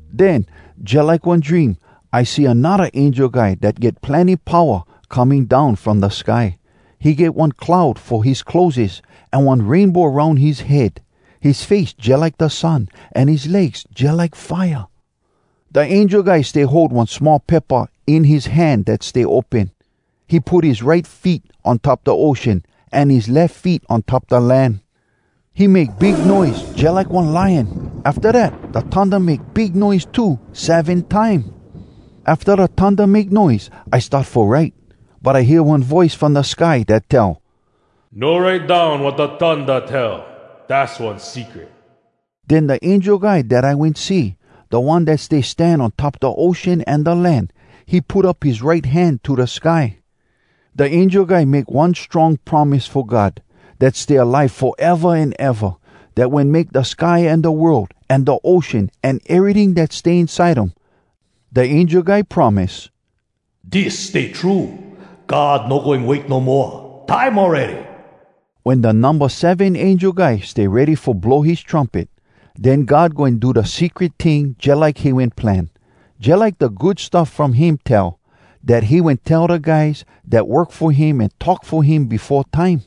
Den, jalike one dream, I see anodda angel guy dat get plenny powa, coming down from da sky. He get one cloud fo his clotheses, an one rainbow aroun his head. His face jalike da sun, an his legs jalike fire. Da angel guy stay hold one small paypa in his hand dat stay open. He put his right feet on top da ocean, an his lef feet on top da land. He make big noise, jalike one lion. Afta dat, da thunda make big noise too, seven time. Afta da thunda make noise, I start fo write. But I hear one voice from da sky dat tell, “No write down wat da thunda tell. Dass one secret.” Den da angel guy dat I wen see, da one dat stay stan on top da ocean an da land, he put up his right hand to da sky. Da angel guy make one strong promise fo God, dat stay alive foeva an eva, dat wen make da sky an da world, an da ocean, an eryting dat stay inside um. Da angel guy promise, “Dis stay true: God no goin wait no moa! Time awready!” Wen da numba seven angel guy stay ready fo blow his trumpet, den God goin do da secret ting jalike he wen plan, jalike da Good Stuff From Him tell, dat he wen tell da guys dat work fo him an talk fo him befo time.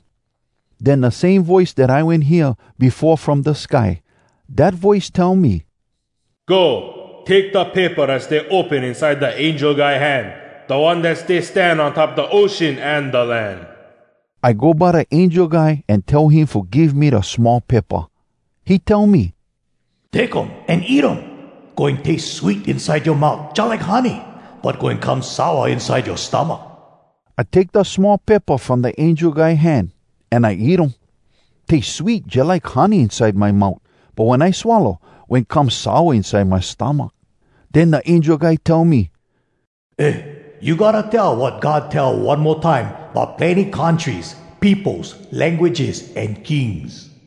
Den da same voice dat I wen hear befo from da sky, dat voice tell me, “Go, take da paypa dat stay open inside da angel guy hand, da one dat stay stan on top da ocean an da land.” I go by da angel guy an tell him fo give me da small paypa. He tell me, “Take um an eat um. Goin taste sweet inside yoa mout jalike honey. But goin come sour inside yoa stomach.” I take da small paypa from da angel guy hand, an I eat um. Taste sweet jalike honey inside my mout, but wen I swallow, wen come sour inside my stomach. Den da angel guy tell me, “Eh, you gotta tell wat God tell one mo time bout plenny countries, peopos, languages, an kings.”